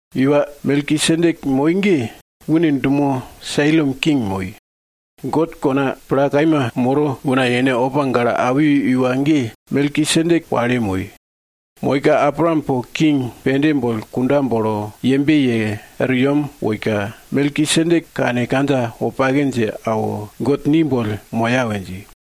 Iwa Melkisedek moi ge, une dumo Salem king moi. God kona pla kaima moro una yene opa gale awi iwa ge, Melkisedek wale moi. Moika, Abraam po king pende boll kunda bolo yembe ye er yem woika, Melkisedek kane kandja wopake dje awo, God ni boll moya we dji.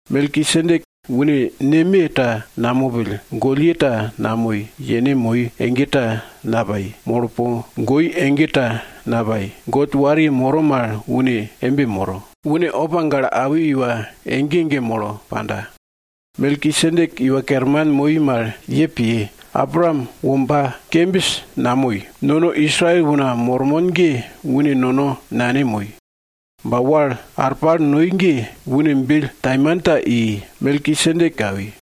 Melkisedek, une neme ta namopill, gollye ta namoi, yene moi ege ta napai, molo po goi ege ta napai. God wariye moro mal une embe moro. Une opa gale awi iwa ege ege molo panda. Melkisedek iwa kerman moi mal ye piye. Abraam womba kembis namoi, nono Israel una mormon ge une nono nane moi. Ba wal arpal noi ge, une bill taimanta i Melkisedek awi.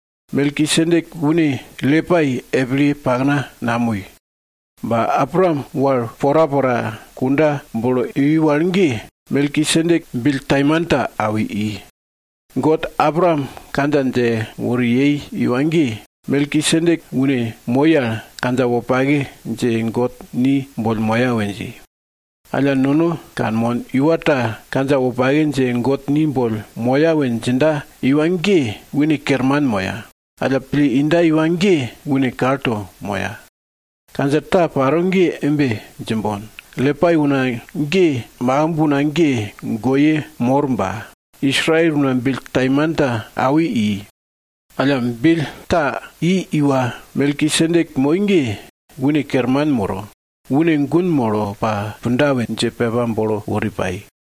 Melkisedek une Lipai epilye pakna namoi. Ba Abraam wal porapora kunda bolo iwi wal ge, Melkisedek bill taimanta awi i. God Abraam kandja dje wori yei iwa ge, Melkisedek une moi al kandja wopake dje God ni boll moya we dji. Alla, nono kanmon, iwa ta kandja wopake dje God ni boll moya we djinda iwa ge, une kerman moya. Alla, pille inda iwa ge une kalto moya. Kandja ta paro ge embe djimbon, Lipai una ge makimb una ge goye mor ba, Israel una bill taimanta awi i. Alla, bill ta i iwa Melkisedek moi ge, une kerman moro, une gun molo pa punda we dje pepa bolo wori pai.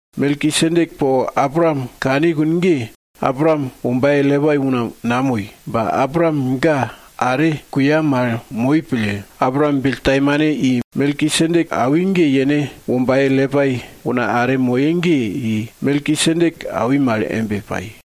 Melkisedek po Abraam kani kune ge, Abraam wombaye Lipai una namoi. Ba Abraam ga are kuya mal moi pille, Abraam bill taimane i Melkisedek awi ge, yene wombaye Lipai una are moye ge i Melkisedek awi mal embe pai.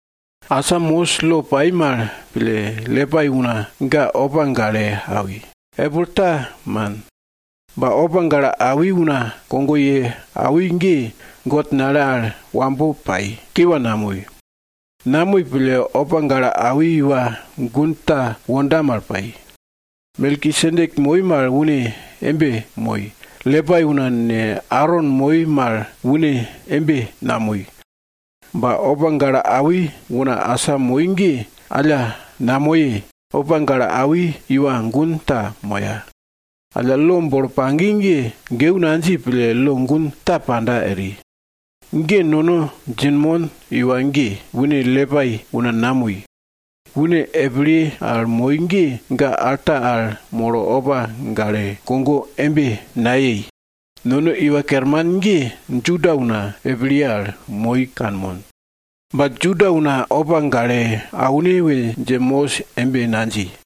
Asa Mosis lo pai mal pille, Lipai una ge opa gale awi, epil ta man. Ba opa gale awi una kogo ye awi ge, God nale al wambo pai, kiwa namoi. Namoi pille, opa gale awi iwa gun ta wonda mal pai. Melkisedek moi mal une embe moi, Lipai una ne, Aron moi mal une embe namoi. Ba, opa gale awi una asa moi ge alla namoye, opa gale awi iwa gun ta moya. Alla, lo bolo pagi ge, geu nadji pille, lo gun ta panda eri. Ge nono djinmon iwa ge, une Lipai una namoi. Une epilye al moi ge, ga alta al molo opa gale kogo embe nayei. Nono Iwa Kerman ge Juda una epilye al moi kanmon. Ba Juda una opa gale aune we dje Mosis embe nadji.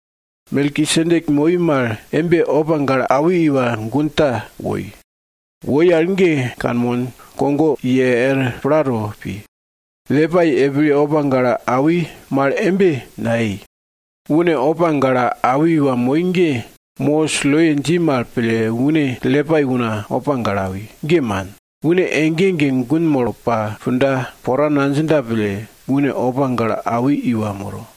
Melkisedek moi mal embe opa gale awi iwa gun ta woi. Woi al ge kanmon, kogo ye er plato pi. Lipai epil opa gale awi mal embe nayei. Une opa gale awi iwa moi ge, Mosis loye dji mal pille une Lipai una opa gale awi, ge man. Une ege ege gun molo pa punda pora nadjinda pille, une opa gale awi iwa moro.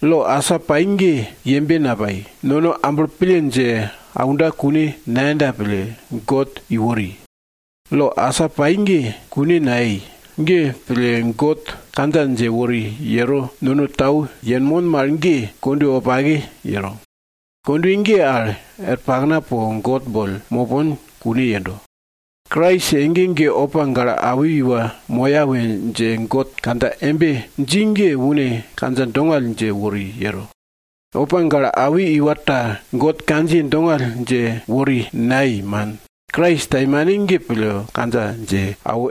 Lo asa pai ge, yembe napai, nono amblo pille dje aunda kune nayenda pille, God iwori. Lo asa pai ge, kune nayei. Ge pille God kandja dje wori yero nono tau yenmon mal ge kondwe wopake yero. Kondwe ge al er pakna po God boll mopon kune yendo. Krais ege ege opa gale awi iwa moya we dje God kandja embe dji ge, une kandja dongall dje wori yero. Opa gale awi iwa ta God kandjiye dongall dje wori nayei, man, Krais taimane ge pille kandja dje awo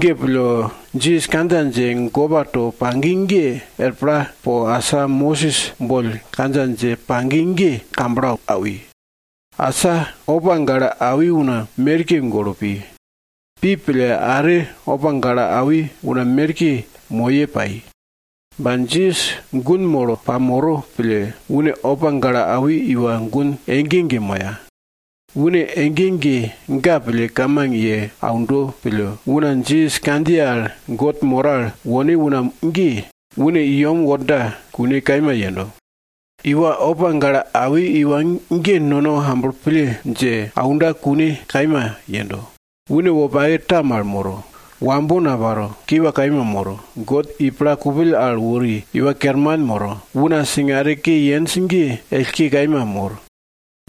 Ge pille, Jisas kandja dje gopa to pagi ge er pla po asa Mosis boll kandja dje pagi ge kamblo awi. Asa opa gale awi una merke golo pi. Pi pille, are opa gale awi una merke moye pai. Ba Jisas gun molo pamoro pille, une opa gale awi iwa gun ege ege moya. Une ege ege ga pille kamang ye aundo pille, una Jisas kandjiye al God moro al wone una ge, une i yem worda kune kaima yendo. Iwa opa gale awi iwa ge nono amblo pille dje aunda kune kaima yendo. Une wopake ta mal moro. Wambo naparo, kiwa kaima moro. God i pla kupill al wori iwa kerman moro, una singare ke yenj ge ellke kaima mor.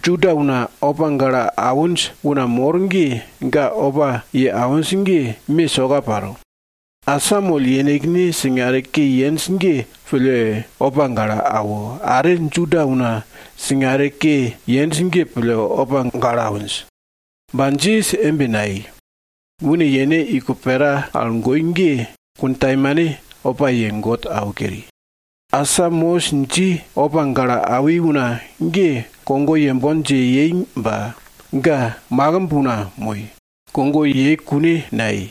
Juda una opa gale awinj una mor ge, ga opa ye awinj ge, me soka paro. Asamoll yenekne singare ke yenj ge pille opa gale awo, are Juda una singare ke yenj ge pille opa gale awinj. Ba Jisas embe nayei. Une yene iko pera al goi ge kuntaimane opa ye God awo keri. Asa Mosis dji opa gale awi una ge, kogo yembon dje yei ba ga makimb una moi, kogo yei kune nayei.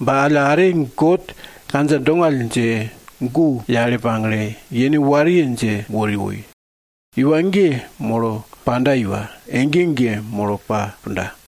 Ba alla are, God kandja dongall dje gu yale pagle, yene wariye dje wori woi. Iwa ge molo panda iwa, ege ege molo pa punda.